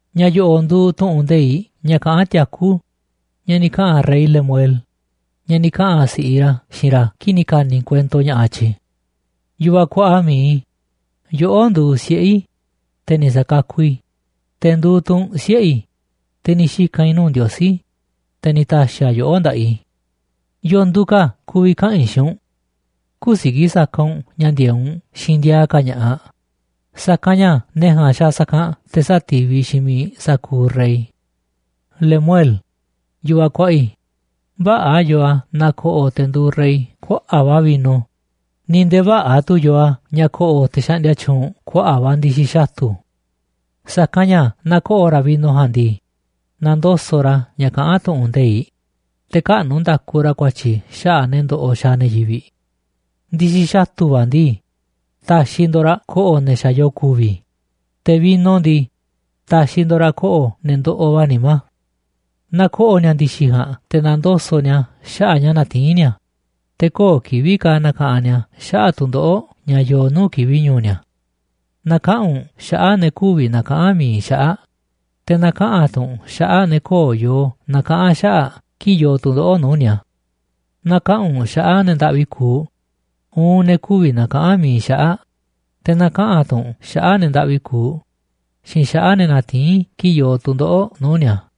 Ña̱ yo̱ꞌo̱ꞌ nduuꞌ tu̱ꞌu̱n nde̱iꞌ ña̱ kaꞌán tiakú ña̱ ni̱ kaꞌa̱n rey Lemuel, ña̱ ni̱ kaꞌa̱n si̱ꞌiꞌ ra̱ xiinꞌ ra̱ kii̱ꞌ ni̱ ka̱ni̱ kuento ña̱ꞌaꞌ tyi̱. Yu̱vaꞌ kuaꞌa mi̱iꞌ i̱, yoꞌó nduuꞌ siꞌe̱ i̱, te̱ ni̱ sa̱kakuꞌ i̱, te̱ nduuꞌ tu̱ u̱nꞌ siꞌe̱ i̱, te̱ ni̱ xika̱n i̱ nuu̱ꞌ Ndiosí, te̱ ni̱ ta̱xi̱ a̱ yoꞌó nda̱ꞌaꞌ i̱. ¿Yoo nduuꞌ ka̱ a̱ ku̱vi̱ kaꞌa̱n i̱ xiinꞌ u̱nꞌ? Kü̱siki̱ꞌ saka u̱nꞌ ña̱ ndi̱e̱eꞌ u̱nꞌ xiinꞌ ndiaa ka̱ ña̱ꞌaꞌ, sa̱kanꞌ ña̱ ne̱ ja̱a̱nꞌ xaaꞌ sa̱kanꞌ te̱ sati̱viꞌ xiinꞌ miiꞌ sa̱kuuꞌ rey. Lemuel, yu̱vaꞌ kuaꞌa i̱, vä̱ꞌa̱ yoo a̱ naaꞌ ko̱ꞌo̱ te̱ nduuꞌ rey kuaꞌa̱ꞌ va̱ vino, ni̱ nde̱e̱ vä̱ꞌa̱ tu̱ yoo a̱ ña̱ ko̱ꞌo̱ te̱ xaꞌndia tyuunꞌ kuaꞌa̱ꞌ va̱ ndi̱xi̱ xatu̱. Sa̱kanꞌ ña̱ naaꞌ ko̱ꞌo̱ ra̱ vino ja̱a̱nꞌ ndii, na̱ndoso̱ꞌ ra̱ ña̱ kaꞌán tu̱ꞌu̱n nde̱iꞌ, te̱ käꞌnu̱ nda̱ku ra̱ ku̱a̱tyi̱ xaꞌa̱ꞌ ne̱ ndoꞌoꞌ xaaꞌ ne̱ yivi̱ꞌ. Ndi̱xi̱ xatu̱ va̱ ndii, ta̱xi̱ ndo̱ꞌ raꞌ ko̱ꞌo̱ ne̱ xa̱ yoo ku̱vi̱, te̱ vino ndii, ta̱xi̱ ndo̱ꞌ raꞌ ko̱ꞌo̱ ne̱ ndoꞌoꞌ va̱ nimá. Na ko̱ꞌo̱ ni̱a̱ ndi̱xi̱ ja̱a̱nꞌ te̱ na̱ndoso̱ꞌ ni̱a̱ xaꞌa̱ꞌ ña̱ natiín ni̱a̱, te̱ köo̱ꞌ kivi̱ꞌ ka̱ na̱ka̱ꞌanꞌ ni̱a̱ xaꞌa̱ꞌ tu̱ndoꞌo̱ꞌ ña̱ yoo nuu̱ꞌ kivi̱ꞌ ñu̱u̱ ni̱a̱. Na̱kaꞌa̱n u̱nꞌ xaꞌa̱ꞌ ne̱ kü̱vi̱ na̱kaꞌa̱n mi̱iꞌ xaꞌa̱ꞌ, te̱ na̱kaꞌa̱n tu̱ u̱nꞌ xaꞌa̱ꞌ ne̱ köo̱ꞌ yoo na̱kaꞌa̱n xaꞌa̱ꞌ kii̱ꞌ yoo tu̱ndoꞌo̱ꞌ nuu̱ꞌ ni̱a̱. Na̱kaꞌa̱n u̱nꞌ xaꞌa̱ꞌ ne̱ ndaꞌvi kuuꞌ uun ne̱ kü̱vi̱ na̱kaꞌa̱n mi̱iꞌ xaꞌa̱ꞌ, te̱ na̱kaꞌa̱n tu̱ u̱nꞌ xaꞌa̱ꞌ ne̱ ndaꞌvi kuuꞌ xiinꞌ xaꞌa̱ꞌ ne̱ natiín kii̱ꞌ yoo tu̱ndoꞌo̱ꞌ nuu̱ꞌ ni̱a̱.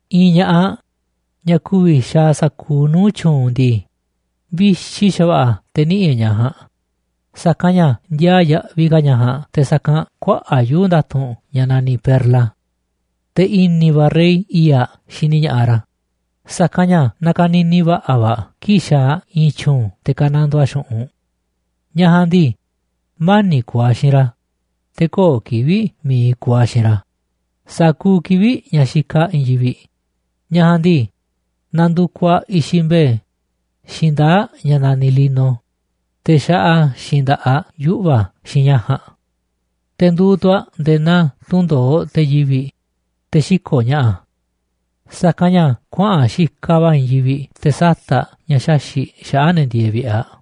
I̱i̱n ña̱ꞌaꞌ, ñaꞌ ku̱vi̱ xaaꞌ sa̱kuuꞌ nuu̱ꞌ tyu̱u̱n ndii, vixi xa̱va̱ꞌa̱ te̱ niꞌi̱ꞌ e̱ꞌ ñaꞌ ja̱a̱nꞌ, sa̱kanꞌ ña̱ ndiaa yaꞌviꞌ ka̱ ñaꞌ ja̱a̱nꞌ te̱ sa̱kanꞌ kuaꞌa̱ꞌ yuu̱ꞌ nda̱tu̱nꞌ ña̱ naniꞌ perla. Te̱ i̱ni̱ va̱ rey i̱i̱ꞌ aꞌ xini ña̱ꞌaꞌ ra̱, sa̱kanꞌ ña̱ nakanini va̱ꞌa̱ va̱ aꞌ kii̱ꞌ xaaꞌ aꞌ i̱i̱n tyu̱u̱n te̱ ka̱nandoo aꞌ xu̱ꞌunꞌ. Ñaꞌ ja̱a̱nꞌ ndii, mani̱ꞌ kuuꞌ aꞌ xiinꞌ ra̱, te̱ köo̱ꞌ kivi̱ꞌ mi̱iꞌ kuuꞌ aꞌ xiinꞌ ra̱, sa̱kuuꞌ kivi̱ꞌ ña̱ xikaꞌ aꞌ i̱i̱n yivi̱ꞌ. Ñaꞌ ja̱a̱nꞌ ndii, nandukuꞌ aꞌ i̱xiꞌ mbe̱e̱ xiinꞌ ndaa̱ꞌ ña̱ naniꞌ lino, te̱ xaꞌa xiinꞌ nda̱ꞌaꞌ aꞌ yuꞌva̱ xiinꞌ ña̱ ja̱a̱nꞌ. Te̱ nduuꞌ tu̱ aꞌ nde̱e̱ naa tundo̱oꞌ te̱ yivi̱ꞌ, te̱ xiko̱ꞌ ña̱ꞌa̱, sa̱kanꞌ ña̱ kuaꞌa̱n aꞌ xikaꞌ va̱ i̱i̱n yivi̱ꞌ te̱ sata̱ꞌ aꞌ ña̱ xaxi̱ꞌ xaꞌa̱ꞌ ne̱ ndieeꞌ vi̱ꞌe̱ aꞌ.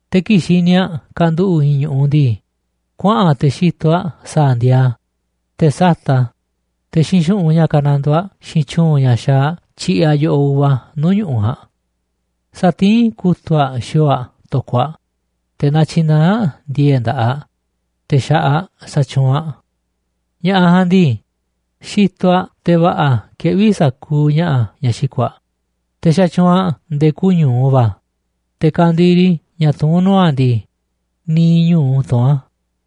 Te̱ kii̱ꞌ xini aꞌ kanduꞌu̱ꞌ i̱i̱n ñu̱ꞌuꞌ ndii, kuaꞌa̱n te̱ xitoꞌ aꞌ sa̱a̱ ndiaa a̱, te̱ sata̱ꞌ aꞌ, te̱ xiinꞌ xu̱ꞌunꞌ ña̱ kanandoo aꞌ xiinꞌ tyu̱u̱n ña̱ xaaꞌ aꞌ tyiꞌiꞌ aꞌ yo̱ꞌoꞌ uva nuu̱ꞌ ñu̱ꞌuꞌ ja̱a̱nꞌ. Satiín kutu̱ꞌ aꞌ xi̱o̱o̱ aꞌ to̱koꞌ aꞌ, te̱ natyinaá aꞌ ndi̱e̱e̱ꞌ nda̱ꞌaꞌ, te̱ xa̱ꞌaꞌ aꞌ sa̱tyuunꞌ aꞌ. Ña̱ꞌaꞌ ja̱a̱nꞌ ndii, xitoꞌ aꞌ te̱ va̱ꞌa̱ keꞌví sa̱kuuꞌ ña̱ꞌa̱ ña̱ xiko̱ꞌ aꞌ, te̱ xatyuunꞌ aꞌ nde̱e̱ kuuꞌ ñu̱u va̱, te̱ ka̱ndiri ña̱ tuún nuu̱ꞌ aꞌ ndii, niiꞌ ñu̱u tuún a̱.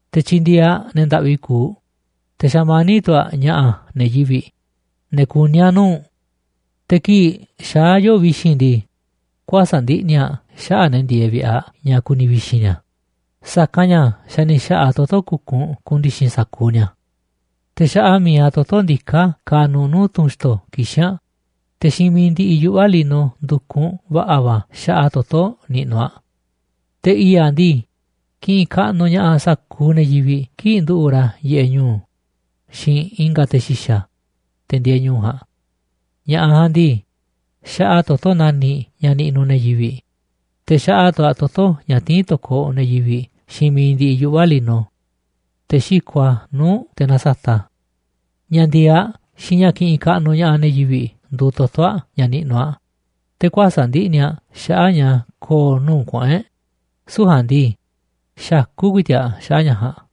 Te̱ tyindieeꞌ aꞌ ne̱ ndaꞌvi kuuꞌ, te̱ xamaníꞌ tu̱ a̱ ña̱ꞌa̱ ne̱ yivi̱ꞌ, ne̱ kuní a̱ nuu̱ꞌ. Te̱ kii̱ꞌ xaá yoo̱ꞌ vi̱xi̱n ndii, kuäsa̱ꞌ ndiꞌni̱ aꞌ xaꞌa̱ꞌ ne̱ ndieeꞌ vi̱ꞌe̱ aꞌ ña̱ ku̱ni̱ vi̱xi̱n ni̱a̱, sa̱kanꞌ ña̱ xa̱ ni̱ xa̱ꞌa̱ aꞌ toto̱ kukunꞌ ku̱ndi̱xi̱n sa̱kuuꞌ ni̱a̱. Te̱ xaꞌa mi̱iꞌ aꞌ toto̱ ndiká kanuꞌ nuu̱ꞌ tunꞌ xto̱ kixín aꞌ, te̱ xiinꞌ mi̱iꞌ ndiꞌiꞌ yuꞌva̱ lino ndu̱kunꞌ va̱ꞌa̱ va̱ xaꞌa aꞌ toto̱ niꞌnuꞌ aꞌ. Te̱ i̱i̱ꞌ aꞌ ndii, kiꞌinꞌ kaꞌnuꞌ ña̱ꞌaꞌ sa̱kuuꞌ ne̱ yivi̱ꞌ kii̱ꞌ nduꞌu̱ꞌ ra̱ yiꞌeꞌ ñu̱u̱ xiinꞌ i̱nga̱ te̱ xi̱xa̱, te̱ ndieeꞌ ñu̱u̱ ja̱a̱nꞌ. Ña̱ꞌaꞌ ja̱a̱nꞌ ndii, xaꞌa aꞌ toto̱ nani̱ꞌ ña̱ niꞌnuꞌ ne̱ yivi̱ꞌ, te̱ xaꞌa tu̱ aꞌ toto̱ ña̱ tiín to̱koꞌ ne̱ yivi̱ꞌ xiinꞌ mi̱iꞌ ndiꞌiꞌ yuꞌva̱ lino, te̱ xiko̱ꞌ aꞌ nuu̱ꞌ te̱ nasata̱ꞌ a̱. Ña̱ ndi̱e̱eꞌ aꞌ xiinꞌ ña̱ kiꞌinꞌ kaꞌnuꞌ ña̱ꞌaꞌ ne̱ yivi̱ꞌ nduuꞌ toto̱ aꞌ ña̱ niꞌnuꞌ aꞌ, te̱ kuäsa̱ꞌ ndiꞌni̱ aꞌ xaꞌa̱ꞌ ña̱ ko̱o̱ nuu̱ꞌ kuꞌu̱n e̱ꞌ, süu̱ꞌ ja̱a̱nꞌ ndii, xakú ku̱i̱ti̱ꞌ aꞌ xaꞌa̱ꞌ ña̱ ja̱a̱nꞌ.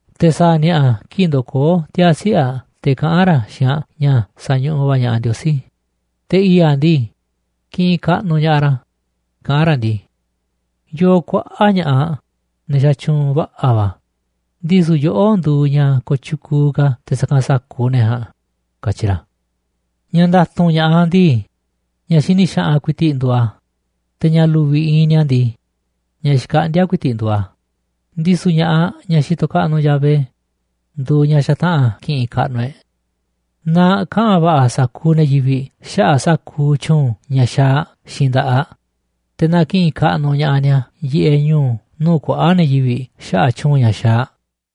Te̱ sa̱a̱ ni̱a̱ꞌa̱ kii̱ꞌ ndokoó tiaa̱ siꞌe̱ aꞌ te̱ kaꞌán ra̱ xiinꞌ aꞌ ña̱ sañuꞌuꞌ va̱ ña̱ꞌaꞌ Ndiosí, te̱ i̱i̱ꞌ aꞌ ndii, kiꞌinꞌ kaꞌnuꞌ ña̱ꞌaꞌ ra̱, kaꞌán ra̱ ndii: “Yoo kuaꞌa̱ꞌ ña̱ꞌaꞌ, ne̱ xatyuunꞌ va̱ꞌa̱ va̱, ndisu̱ yoꞌó nduuꞌ ñaꞌ kooꞌ tyukuuꞌ ka̱ te̱ sa̱kanꞌ sa̱kuuꞌ ne̱ ja̱a̱nꞌ”, katyi ra̱. Ña̱ nda̱tu̱nꞌ ña̱ꞌaꞌ ndii, ña̱ xini xaꞌanꞌ ku̱i̱ti̱ꞌ nduuꞌ a̱, te̱ ña̱ lu̱vi̱ iinꞌ ni̱a̱ ndii, ña̱ xkaꞌndíá ku̱i̱ti̱ꞌ nduuꞌ a̱, ndisu̱ ña̱ꞌaꞌ ñaꞌ xitoꞌ kaꞌnuꞌ Yahvé nduuꞌ ñaꞌ xataꞌa̱n ki̱ꞌi̱n kaꞌnuꞌ e̱ꞌ. Na kaꞌa̱n va̱ꞌa̱ sa̱kuuꞌ ne̱ yivi̱ꞌ xaꞌa̱ꞌ sa̱kuuꞌ tyu̱u̱n ña̱ xaaꞌ aꞌ xiinꞌ nda̱ꞌaꞌ aꞌ, te̱ na ki̱ꞌi̱n kaꞌnuꞌ ña̱ꞌaꞌ ni̱a̱ yiꞌeꞌ ñu̱u̱ nuu̱ꞌ kuaꞌa̱ꞌ ne̱ yivi̱ꞌ xaꞌa̱ꞌ tyu̱u̱n ña̱ xaaꞌ aꞌ.